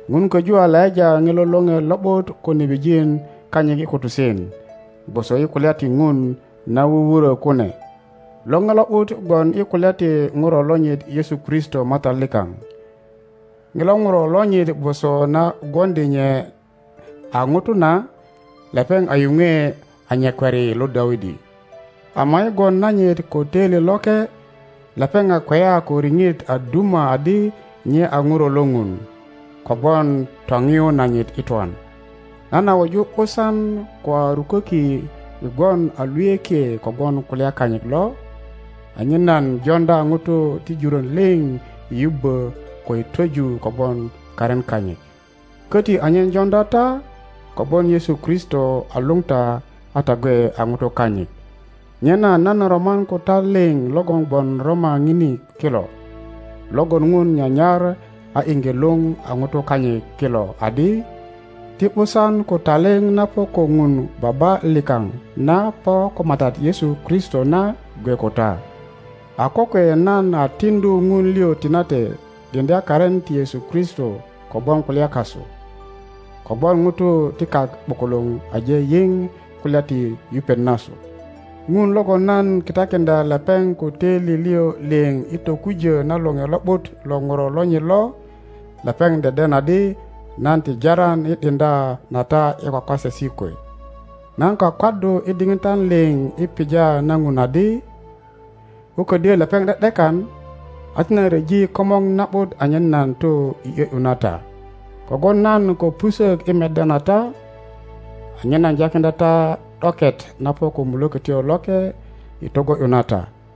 Ŋun koju a laŋa ŋilo Loŋe Lo ’but ko nebijin kanyit i kutusen, gwoso i kulya ti Ŋun na wuwurö kune. Loŋe Lo ’but gwon i kulya ti Ŋuro lonyit Yesu Kristo Matat likaŋ. Ŋilo Ŋuro lonyit gwoso na gwoŋdi nye a Ŋuto na, lepeŋ a yuŋwe a nyakwari lo Dawidi; ama i gwon nanyit ko toili loke, lepeŋ a kweya ko riŋit a duma adi nye a Ŋuro lo Ŋun, kogwon toŋiyu nanyit i twan. Nan a wuju ’busan ko a ruköki i gwon a luyökie kogwon kulya kanyit lo, anyen nan joŋdya ŋutu ti juron liŋ i yubbo ko i twoju kogwon karin kanyit. Koti anyen joŋdya ta, kogwon Yesu Kristo a luŋ ta a ta gwe a ŋutu kanyit. Nyena nan roman ko ta liŋ logon gwon Roma ŋini kilo, logon Ŋun nyanyar a iŋge luŋ a ŋutu kanyit kilo adi, Ti ’busan ko taliŋ na po ko Ŋun Baba likaŋ na po ko Matat Yesu Kristo na gwe ko ta. A kokwe nan a tiŋdu Ŋun liŋ tinate ’diŋdya karin ti Yesu Kristo kogwon kulya kasu, kogwon ŋutu ti kak ’bukuluŋ aje yiŋ kulya ti yupet nasu. Ŋun logon nan kitakiŋdya lepeŋ ko töili liŋ liŋ i tokujö na Loŋe Lo ’but lo ŋuro lonyit lo, lepeŋ deden adi nan ti Taran i ’diŋdya na ta i kwakwasesi kwe. Nan kwakwaddu i diŋitan liŋ i pija na Ŋun adi, ko ködyö lepeŋ de ’dekan, a ti nan ryeji komor na ’but anyen nan tu i ’yö ’yu na ta. Kogwon nan ko pusök i meddya na ta, anyen nan jakiŋdya ta ’doket na po ko Mulökötyo Loke i togo ’yu na ta;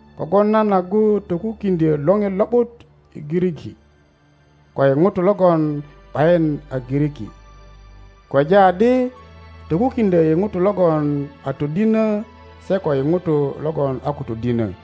Kogwon nan agu tokukiŋdyö Loŋe Lo ’but i Giriki ko i ŋutu logon ’bayin a Giriki, kweja adi tokukiŋdyö i ŋutu logon a todinö se ko i ŋutu logon a ko todinö.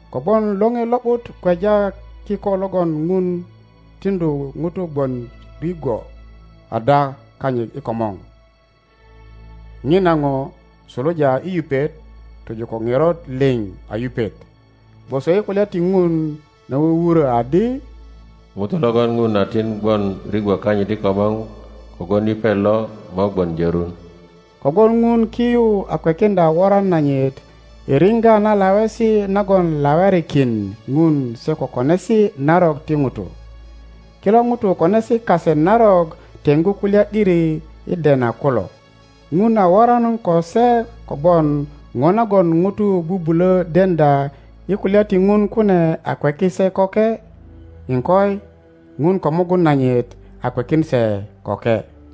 Kogwon Loŋe Lo ’but kweja kiko logon Ŋun tiŋdu ŋutu gwon rigwo ada kanyit i komor; ŋina ŋo suluja i yupet tojo ko ŋerot liŋ a yupet, gwoso i kulya ti Ŋun na wuwurö adi, ŋuto lögon Ŋun a tin gwon rigwo kanyit i komor kogwon yupet lo mo gwon jörun. Kogwon ŋun ki yu a kwekiŋdya woran nanyit i riŋga na lawesi nagon lawerikin Ŋun se ko konesi narok ti ŋutu. Kilo ŋutu konesi kase narok teŋggu kulya ’diri i dena kulo. Ŋun a woran ko se kogwon ŋo nagon ŋutu bubulö deŋdya i kulya ti ŋun kune a kweki se köke; iŋkoi, Ŋun ko mugun nanyit a kwekin se köke.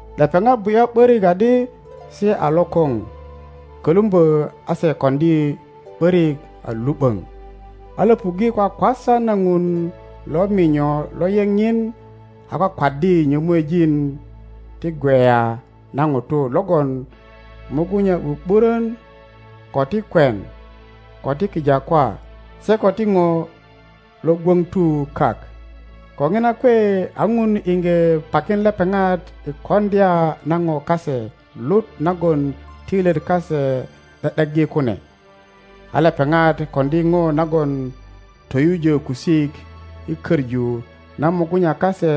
Lepeŋat bu ’ya ’börik adi se a lokoŋ kölumbö a se koŋdi ’börik a lu ’böŋ, a Iöpuŋge kwakwasa na Ŋun lo minyo lo yeŋ nyin a kwakwaddi nyomuejin ti gweya na ŋutu logon mugunya ’bu ’buron, ko ti kwen, ko ti kijakwa se ko ti ŋo lo gwoŋtu kak. Ko ŋina kwe a ŋun iŋge pakin lepeŋat i koŋdya na po kase lut nagon toilyet kase ’de ’deggi kune, a lepeŋat koŋdi ŋo nagon toyujö kusik i koŋu na mugunya kase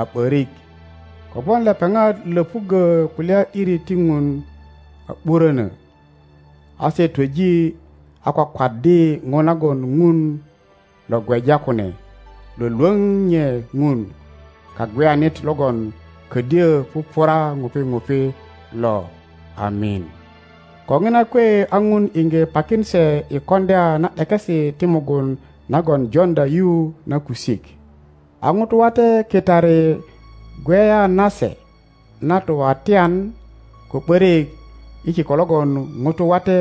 a ’borik. Kogwon lepeŋat Iöpuggo kulya ’diri ti Ŋun a ’burönö, a se twöji a kwakwaddi ŋo nagon Ŋun lo gweja kune lwölwöŋ nye Ŋun Kagweyanit logon ködyo pupura ŋupi ŋupi lo! Amin. Ko ŋina kwe a Ŋun iŋge pakin se i koŋdya na ’dekesi ti mugun nagon joŋdya yu na kusik; a ŋutu wate kitari gweya nase na tuwatyan ko ’börik i kiko logon ŋutu wate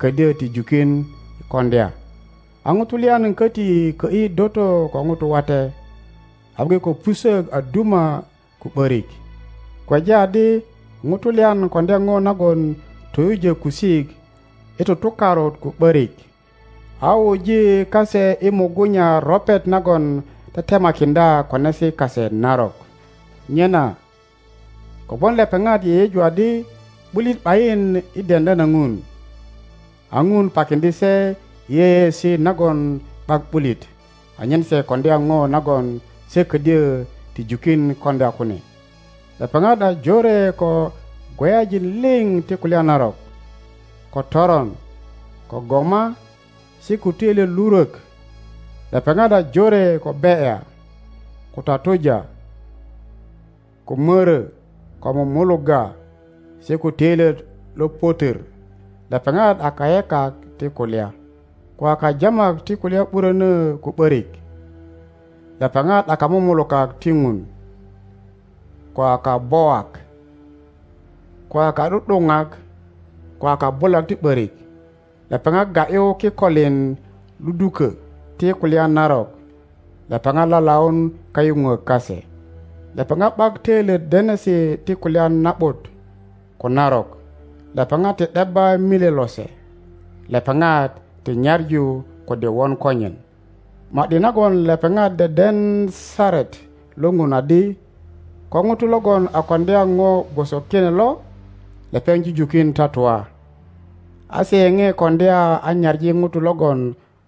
ködyo ti jukin koŋdya; a ŋutu lyan köti kö ’yi doto ko ŋutu wate, a gwe ko pusök a duma ko ’börik. Kweja adi ŋutu lyan koŋdya ŋo nagon toyujö kusik i tutukarut ko ’börik, a wuji kase i mugunya ropet nagon tetemakiŋdya konesi kase narok. Nyena kogwon lepeŋat yeyeju adi ’bulit ’bayin i deŋdya na Ŋun, a Ŋun pakiŋdye se i yeyeesi nagon ’bak ’bulit anyen se koŋdya ŋo nagon se ködyö ti jukin koŋdya kune. Lepeŋat a Jore ko gweyajin liŋ ti kulya narok, ko toron, ko goma, se ko töilyet lurwök. Lepeŋat a jore ko be ’ya, ko tatuja. ko mörö, ko mululugga, se ko töilyet lo pötwör. Lepeŋat a kayekak ti kulya, ko a kajamak ti kulya ’buröno ko ’börik, lepeŋat a kamanak ti Ŋun, ko a kabowak, ko a ka ’du ’duŋak, ko a kabulak ti ’börik. Lepeŋat ga ’yu kikoliŋ ludukö ti kulya narok, lepeŋat lalaun kayuŋwok kase, lepeŋat ’bak töilyet denesi ti kulya na ’but ko narok, lepeŋat ti ’debba milye lose, lepeŋat ti nyaŋu kode won konyen. Ma ’di nagon lepeŋat deden saret lo Ŋun adi ko ŋuto logon a koŋdya ŋo gwoso kine lo, lepeŋ jujukin tatua, a se yeoe koŋdya a nyaŋi ŋutu logon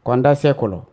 koŋdya se kulo.